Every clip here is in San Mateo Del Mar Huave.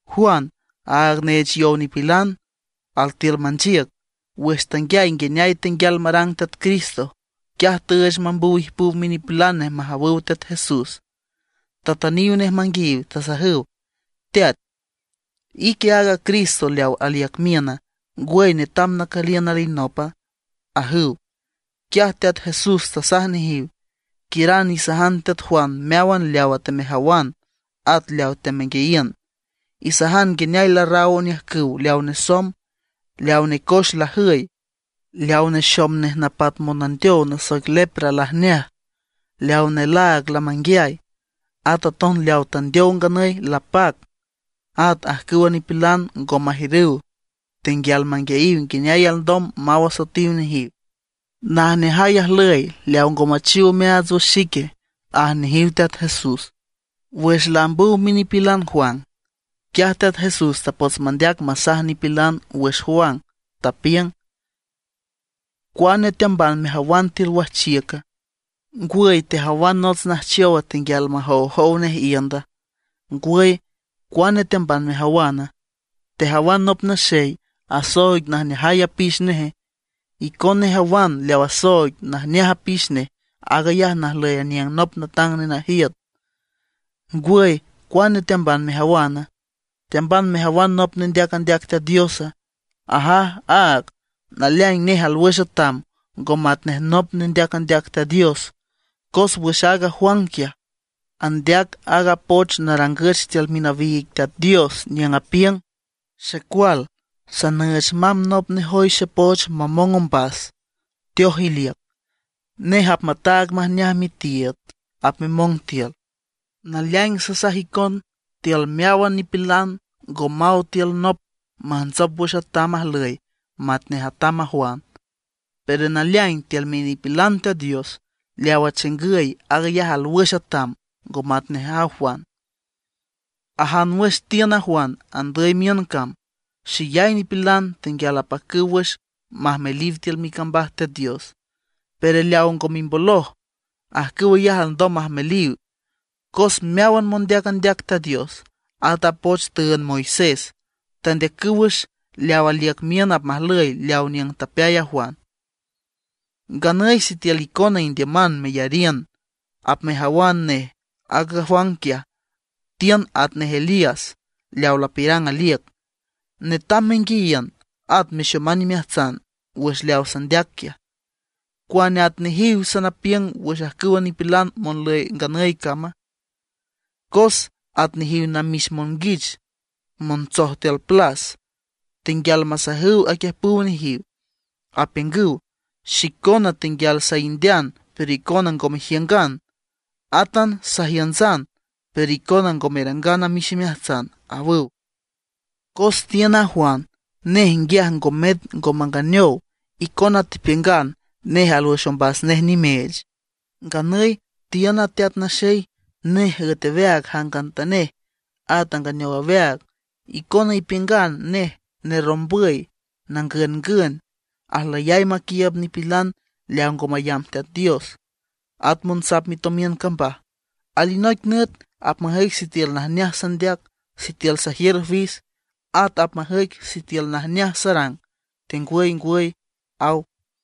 Juan, aaga neech yow nipilan, altiül manchiüc. Wüx tanguiay nguineay tenguial marang Teat Cristo, quiaj tüüch mambüw ijpüw minipilan nej majawüw Teat Jesús. Tatüniw nej manguiayiw, tasajüw: ―¿Teat, ique aaga Cristo leaw aliüc miüna, ngwüy netam nacüliün alinopa? ―ajüw. Quiaj Teat Jesús tasaj nejiw: ―Quiüran isajan teat Juan meáwan leawa temejawan at leawa temenguiayiün. Isajan nguineay larraw oniüjcüw leaw nesomb, leaw necoex lajüy, leaw nexom nej napat monandeow nasoic lepra lajneaj, leaw nelaag lamanguiay, at aton leaw tandeow nganüy lapac, at ajcüwa nipilan ngo majiürüw tenguial manguiayiw nguineay alndom maw asoetiw nejiw. Najneajay ajlüy leaw ngo machiw omeaats wüx xique ―aj nejiw Teat Jesús. Wüx laambüw minipilan Juan, quiaj Teat Jesús tapots mandeac masaj nipilan wüx Juan, tapiüng: ―¿Cuane teamban mejawan tiül wajchiüca? ¿Ngwüy tejawan nots najchowa tenguial majowjow nej iünda? ¿Ngwüy, cuane teamban mejawana? ¿Tejawan nop naxey asooig najneajay apix neje? Icona ijawan leaw asooig najneaj apix nej aag ayaj najlüy aniüng nop natang nenajiüt. ¿Ngwüy, cuane teamban mejawana? ¿Teamban mejawan nop nendeac andeac Teat Diosa? Ajaj áag, naleaing nej alwüx atam ngo matnej nop nendeac andeac Teat Dios. Cos wüx aaga Juan quiaj, andeac aaga poch narangüch tiül minawiig Teat Dios, niüng apiüng: Xecual, sanüüch mamb nop nejoy xepoch mamong ombas, teoj iliüc. Nej apmataag majneaj mitiiüd apmemong tiül. Naleaing sasaj icon, tiül meáwan nipilan ngo maw tiül nop majntsop wüx atam ajlüy matnej atam a Juan. Pero naleaing tiül minipilan Teat Dios, leawa chingüy aag ayaj alwüx atam ngo matnej a Juan. ’Ajan wüx tiün a Juan andüy miün cam, xeyay nipilan tenguial apacüw wüx majmeliw tiül micambaj Teat Dios. Pero leaw ngo mimboloj, ajcüw ayaj alndom majmeliw. Cos meáwan mondeac andeac Teat Dios, at a poch tüünd Moisés tandeacüw wüx leaw aliüc miün apmajlüy aleaw niüng tapeay a Juan. Nganüy sitiül icona indiüman meyariün, apmejawan nej aaga Juan quiaj tiün atnej Elías leaw lapiürang aliüc. Netam menguiayiün at mexoman imeajtsan wüx leaw sandeac quiaj. ’¿Cuane at nejiw sanapiüng wüx ajcüwa nipilan monlüy nganüy cama? Cos at nejiw namix monguich montsoj tiül plas, tenguial masajüw aquiüjpüw nejiw, apiüngüw: “Xicona tenguial saindean pero icona ngo mejiüngan; átan sajiüntsan pero icona ngo merangan amix imeajtsan”, awüw. Cos tiün a Juan, nej nguiaj ngo met ngo manganeow, icona tepiüngan nej alwüx ombas nej nimeech. Nganüy tiün a Teat Naxey, nej üet aweaag jangantanej, at anganeow aweaag. Icona ipiüngan nej nerrombüy nangüngün; ajlüyay maquiiüb nipilan leaw ngo mayamb Teat Dios, at monsap mitomiün cambaj. Alinoic nüt apmajüic sitiül najneaj sandeac, sitiül sajiür fis, at apmajüic sitiül najneaj sarang tengwangwüy ―aw.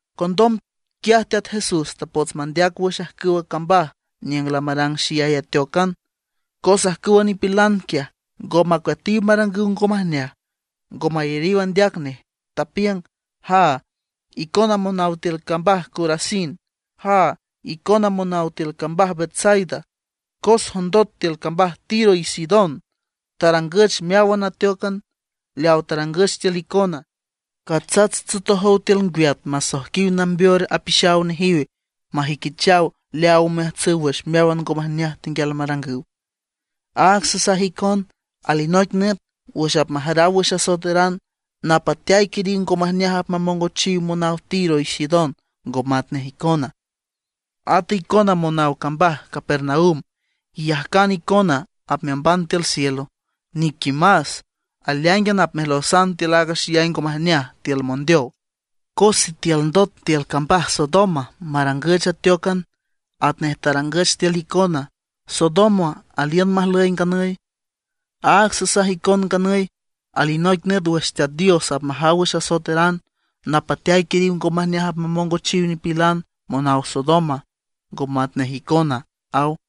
Condom quiaj Teat Jesús tapots mandeac wüx ajcüwa cambaj niüng lamarang xeyay ateócan, cos ajcüwa nipilan quiaj ngo macueatiw marangüw ngo majneaj, ngo mayariw andeac nej. Tapiüng: ―¡Jaa, icona monaw tiül cambaj Corazín! ¡Jaa, icona monaw tiül cambaj Betsaida! Cos jondot tiül cambaj Tiro y Sidón tarangüch meáwan ateócan leaw tarangüch tiül icona, catsats tsotojow tiül ngwiat masoijquiw nambeor apixaw nejiw majüiquichaw leaaw omeajtsüw wüx meáwan ngo majneaj tenguial marangüw. Áag sasaj icon, alinoic nüt wüx apmajaraw wüx asoeteran, napateay quiriw ngo majneaj apmamongochiw monaw Tiro y Sidón, ngo matnej icona. Ata icona monaw cambaj Capernaum, ¿iyajcan icona apmeamban tiül cielo? ¡Niquimas! Aleáingan apmejlosan tiül aaga xeyay ngo majneaj, tiül mondeow. Cos sitiül ndot tiül cambaj Sodoma marangüch ateócan atnej tarangüch tiül icona, Sodoma aliün majlüy nganüy. Áag sasaj icon nganüy, alinoic nüt wüx Teat Dios apmajaw wüx asoeteran, napateay quiriw ngo majneaj apmamongochiw nipilan monaw Sodoma, ngo matnej icona ―aw.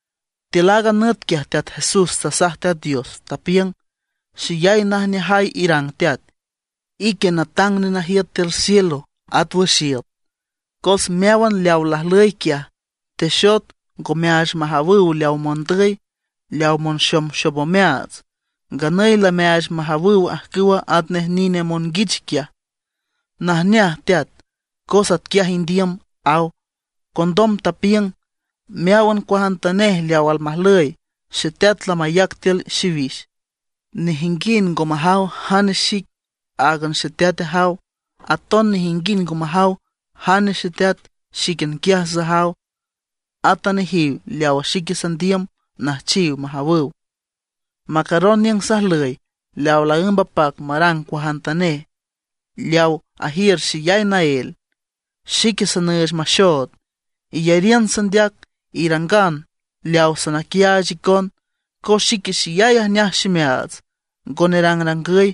Tiül aaga nüt quiaj Teat Jesús tasaj Teat Dios, tapiüng: ―Xeyay najneajay irang Teat, ique natang nenajiüt tiül cielo at wüx iüt. Cos meáwan leawa lajlüy quiaj, texot ngo meaach majawüw leaw mondüy, leaw monxomxom omeaats. Nganüy lameaach majawüw ajcüwa atnej nine monguich quiaj. Najneaj Teat, cos atquiaj indiüm ―aw. Condom tapiüng: ―Meáwan cuajantanej leaw almajlüy, xeteat lamayac tiül xiwix. Nejinguind ngo majaw jane xic, áagan xeteat ajaw. Aton nejinguind ngo majaw jane xeteat, xíquian quiaj sajaw, ata nejiw leawa xique sandiüm nüjchiw majawüw. Macaron niüng sajlüy leawa laǘmb apac marang cuajantanej, leaw ajiür xeyay naél. Xique sanüüch maxood. Iyariün sandeac, irangan leaw sanaquiaach icon, cos xique xeyay ajneaj ximeaats ngo nerangrangüy.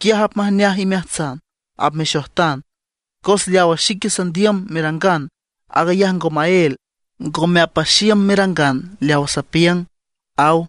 Quiaj apmajneaj imeajtsan, apmexojtan. Cos leawa xique sandiüm merangan, aag ayaj ngo maél; ngome apaxiüm merangan leawa sapiüng ―aw.